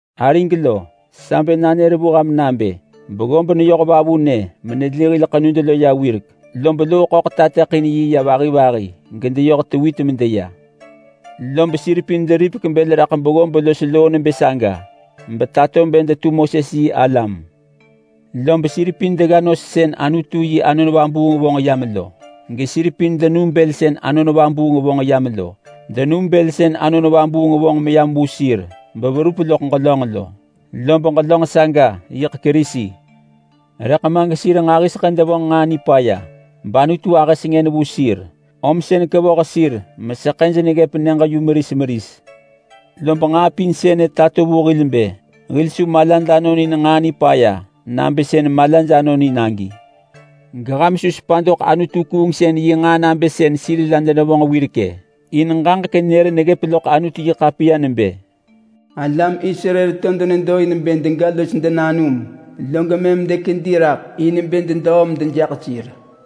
Arig lo, sa bë nanër vu ham nabë beggob neyoh vavunë meneli hil ḳenud lo ya wirek lob Loo-ḳöḳ ruu yi ya vahi vahi gedeyoh tewit medeya. Log sir pin deripek bël raḳ beggob los loo nebë saga benetato bë detu Moses yi alam. Lob sir pin degga nos sën Anutu yi Anon Vabuung vonġ yam lo, gesir pin denum bël sën Anon Vabuung vonġ yam lo. Denum bël sën Anon Vabuung vonġ meneya ving sir beverup loḳ ġelönġ lo, lob ġelönġ saga yiḳ Kerisi. Rëḳ ma gesir nġahiseḳë denevonġ nġaa nipaya bAnutu ahë sengën vu sir, om sën kevoh sir meseḳëj neggëp nyëġ yu meris meris. Lob nġaa pin sënë tato vu hil bë hil su malad anon in nġaa nipaya nabë sën malaj anonin agi. Geham su sepa doḳ anutu-kuungsën yi nġaa nabë sën sir la denevonġ wirek-ë. In ġaġek nër neggëp loḳ Anutu-yi-ḳapiya nebë, “Alam Israel to denedo in bë dega los denanum log mëm dekedi raḳ in bë dedöö medejaḳ sir.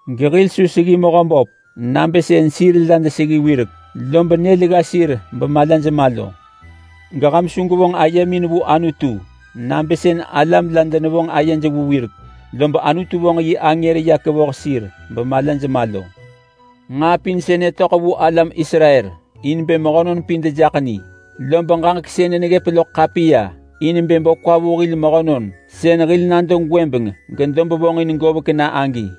Gehil su seggi Mehöböp nabë sën sir la deseggi wirek lob nyël gga sir bemalaj ma lo. Geham su gwevonġ ayemin vu Anutu nabë sën alam la denevonġ ayej vu wirek lob Anutu vonġ yi angër ya kevoh sir bemalaj ma lo. Nġaa pin sënë töḳ vu alam Israel in bë mehönon pin dejaḳ ni, lob ġaġek sënë neggëp loḳ ḳapiya in bë bo kwa vu hil mehönon sën hil nado gwëbeng gedob vonġin govek na agi.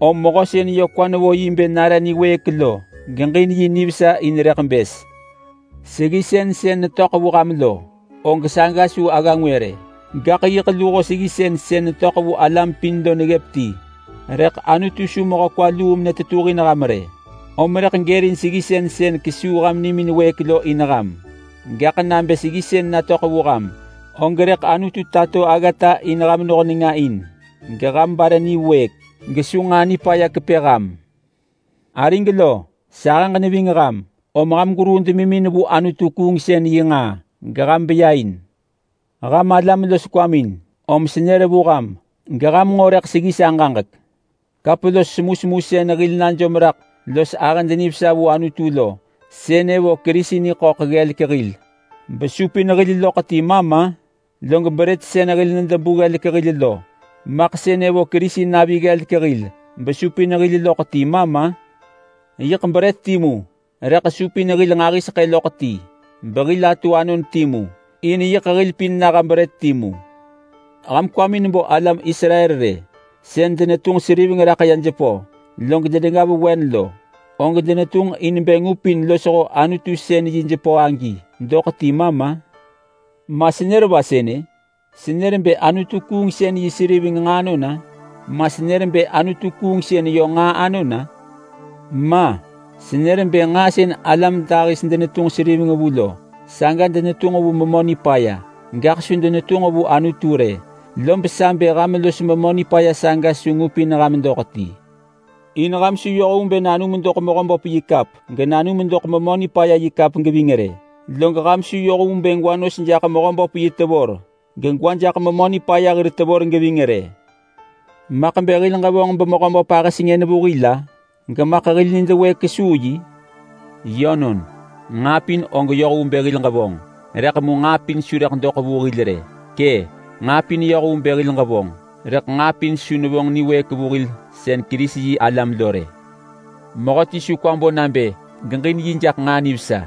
Om mehö sën yö kwa nevo yi bë nare niwëëk lo geġin yi nivesa in rëḳ bës. Seggisën sën netöḳ vu ham lo, og saga su agga ngwë rë, gaḳ yiḳ luho seggisën sën netöḳ vu alam pin lo neggëp ti. Rëḳ Anutu su mehö kwa luu menetetuhin ham rë, om rëḳ gërin seggisën sën rëḳ kesuu ham nimin wëëk lo in ham. Gaḳ nabë seggisën natöḳ vu ham, og rëḳ Anutu tato aggata in ham noh nenga in geham bare niwëëk gesu nġaa nipaya kepë ham. Arig lo! Sahëġ neving ham om ham gweruu demimin vu anutu-kuungsën yi nġaa geham beya in. Ham alam los kwamin, om senër vu ham geham nġo rëḳ seggi sa ġaġek. Kap los semusemu sën hil najom raḳ los ahëd nivesa vu Anutu lo, sënë vo Kerisi niḳöḳ ggelek hil besupin hil loḳ ti ma ma? Log brët sën hil nedebu ggelek hil lo, maḳ sënë vo Kerisi navi ggelek hil besupin hil loḳ ti ma ma? Yiḳ brët timu, rëḳ supin hil nġahiseḳë loḳ ti behil atu anon timu, in yiḳ hil pin naha brët timu. Ham kwamin bo alam Israel rë. Sën denetunġ seriving raḳ ya jepö log denegga vewen lo, og denetunġ in bë ngupin losho Anutu sën yi jepö agi doḳ ti ma ma? Ma senër va sënë? Senër bë anutu-kuungsën yi seriveng nġaa anon-a? Ma senër bë anutu-kuungsën yö nġaa anon-a? Ma! Senër bë nġaa sën alam dahis denetunġ seriveng vu lo, saga denetunġ vu memö nipaya, gaḳ su denetunġ vu Anutu rë. Lob sa bë ham los memö nipaya saga su ngupin ham doḳ ti. In ham su yoh vu bë nanum doḳ Mehöböp yi kap genanum doḳ memö nipaya yi kap geving rë. Log ham su yoh vu bë gwa nos jaḳ Mehöböp yi tevor gegwa jaḳ memö nipaya hir tevor geving rë. Maḳ bë hil ġevonġ beMehöböp ahë sengën vu hil-a? Gemaḳ hil nid wëëk kesuu yi? Yönon! “Nġaa pin og yoh vu bë hil ġevonġ” rëḳ mu nġaa pin su rëḳ doḳ vu hil rë. Kë’! “Nġaa pin yoh vu bë hil ġevonġ”, rëḳ nġaa pin su nevonġ niwëëk vu hil sën Kerisi-yi-alam lo rë. Mehöti su kwa bo nabë geġin yi jaḳ nġaa nivesa,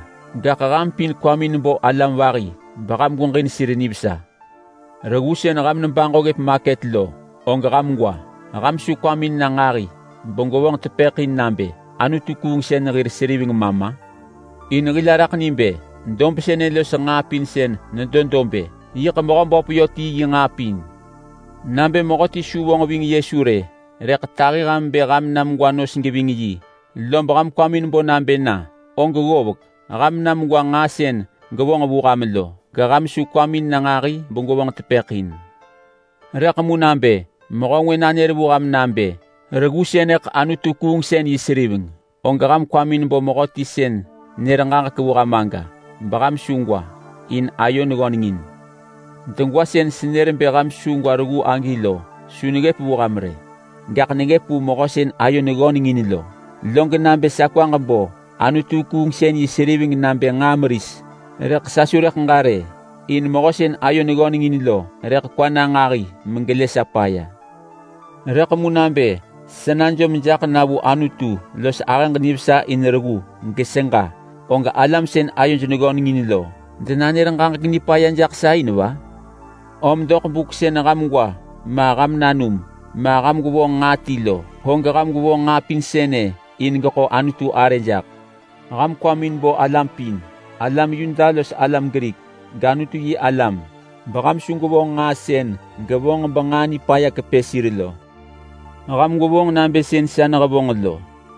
gaḳ ham pin kwamin bo alam vahi beham gweġin sir nivesa. Reggu sën ham nebaġo ggëp maket lo, og ham gwa. Ham su kwamin na nġahi begwevonġ tepëḳ in nabë, “Anutu-kuungsën hir seriveng ma ma?” In hil araḳ ni bë, “Dob sënë los nġaa pin sën nedo dob-ë, yiḳ Mehöböp yö ti yi nġaa pin.” Nabë mehöti su vonġ ving Yesu rë, rëḳ tahi ham bë ham na megwa nos geving yi, lob ham kwamin bo nabë na, og ggovek. Ham na megwa nġaa sën gevonġ vu ham lo, geham su kwamin na nġahi begwevonġ tepëḳ in. Rëḳ mu nabë mehö ngwë nanër vu ham nabë, “Sënëḳ reggu seriveng anutu-kuungsën yi!”, og ham kwamin bo mehöti sën nër ġaġek vu ham aga beham su gwa, in ayo neggöneng in. Degwa sën senër bë ham su gwa reggu agi lo su neggëp vu ham rë, gaḳ neggëp vu mehö sën ayo neggöneng in lo. Log nabë sa kwaġ bo anutu-kuungsën yi seriveng nabë nġaa meris, og sa su rëḳ ġa rë, in mehö sën ayo neggöneng in lo rëḳ kwa na nġahi megelë sa paya. Rëḳ mu nabë sa najom jaḳ na vu Anutu los ahëġ nivesa in reggu geseġa, og alam sën ayoj neggöneng in lo rëḳ denanër ġaġek nipaya jaḳ sa in va? Om doḳ buk sën ham gwa ma ham nanum, ma ham gwevonġ nġaa ti lo, og ham gwevonġ nġaa pin sënë in bë geḳo Anutu arë jaḳ. Ham kwamin bo alam pin, alam Yuda los alam Grik, gAnutu-yi-alam, beham su gwevonġ nġaa sën negelu vahaj benġaa nipaya nekepë sir lo. Ham gwevonġ nabë sën sa nehevonġ lo.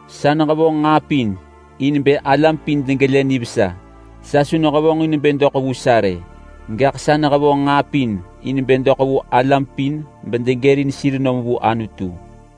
Sa nehevonġ nġaa pin in bë alam pin degelë nivesa. Sa su nehevonġ in bë doḳ vu sa rë, gaḳ sa nehevonġ nġaa pin in bë doḳ vu alam pin bedegërin sir nom vu Anutu.